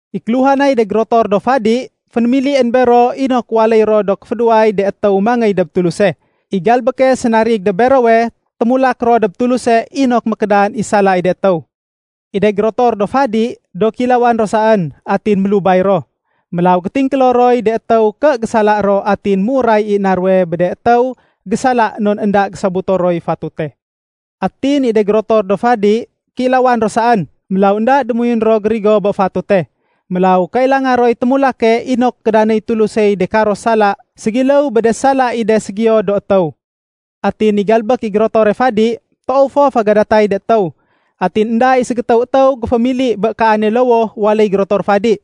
I kéluhanay de gérotor do fadi, fénémilién bero inok waléy ro do kéfédéway de étéw mangéy dob Tuluse. I galbéke sénarig dob berowe, témulak ro dob Tuluse inok mékédan i sala i de étéw. I de gérotor do fadi, do kéilawan ro saén atin mélubay ro. Mélaw gétingkélo roy de étéw ké gésala ro atin méuray i na ruwe bé de étéw gésala non énda gésobuto roy fatute. Atin i de gérotor fadi, kéilawan ro saén, mélaw énda démoyun ro gérigo bé fatute. Mélaw kailanga roy témulake inok kédanéy Tulusey de karo sala ségiléw bé de sala i de ségiyo do étéw. Atin i galbék i gérotore fadi, toow fo fégadatay de étéw. Atin énda i ségétéw étéw géfémili bé kaane lowoh waléy gérotor fadi.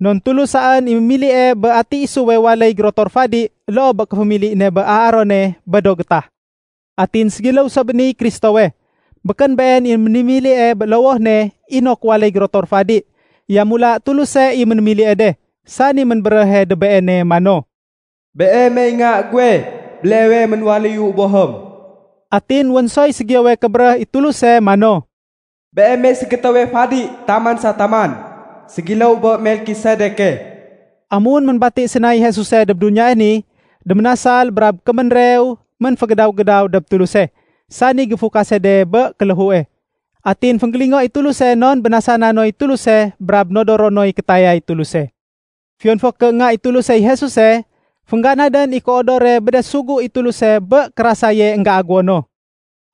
Non Tulus saén i mémilie bé ati isuwe waléy gérotor fadi loo bé kéfémili ne bé Aarone bé do gétah. Atin ségiléw so bé niy Kristowe, békén Been i ménémilie bé lowoh ne inok waléy gérotor fadi. Yamula Tuluse i ménémilie de, sani ménbéréhe dob Beene mano, “Beemey Nga guwe, béleewe ménwaléyu Bohém.” Atin wén soy ségiyowe kébéréh i Tuluse mano, “Beemey ségétéwe fadi taman sa taman, ségiléw bé Melkisedeke.” Amun ménbati sénay Jesuse dob duniyae ni, déménasal brab kéménrew ménfégédaw-gédaw dob Tuluse, sani géfukase de bé kéléhue. Atin fénggélingo i Tuluse non bénasana noy Tuluse brab nodoro noy kétayay Tuluse. Fiyon fo ké Nga i Tulusey Jesuse, féngganadén i kéodore bé de sugu i Tuluse bé kérasaye énggéagéwo no.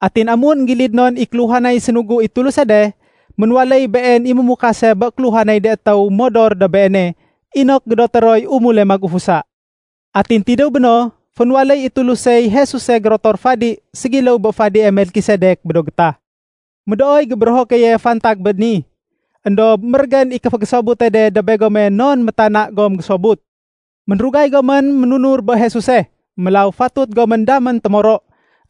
Atin amun énggilid non i kéluhanay sénugu i Tuluse de, ménwaléy Been i mémukase bé kéluhanay de étéw modor dob Beene inok gédoté roy umule magufusa. Atin tidéw béno, fénwaléy i Tulusey Jesuse gérotor fadi ségiléw bé fadie Melkisedek bé do gétah. Médooy gébérého keye fantag bé ni. Endob mérégén i kéfégésobute de dob begome non métana gom gésobut. Ménrugay gomén ménunur bé Jesuse. Mélaw fatut gomén damén do témoro.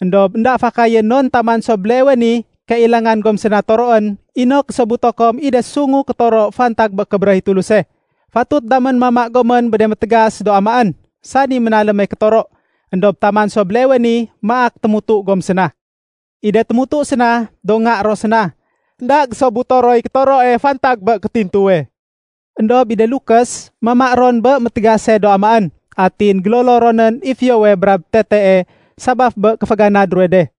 Endob énda fakayén non taman so béleewe ni kailangan gom séna toroén inok gésobuto kom i de sungu kétoro fantag bé kébéréh i Tuluse. Fatut damén mama gomén bé de métégas do amaén, sani ménaléme kétoro, éndob taman so béleewe ni maak témutu gom séna. I de témutu séna, do nga ro séna. Enda gésobuto roy kétoroe fantag bé kétintuwe. Endob i de lukés, mama ron bé métégase do amaén. Atin gélolo ronén i fiyowe brab tetee sabaf bé kéféganad ruwe de.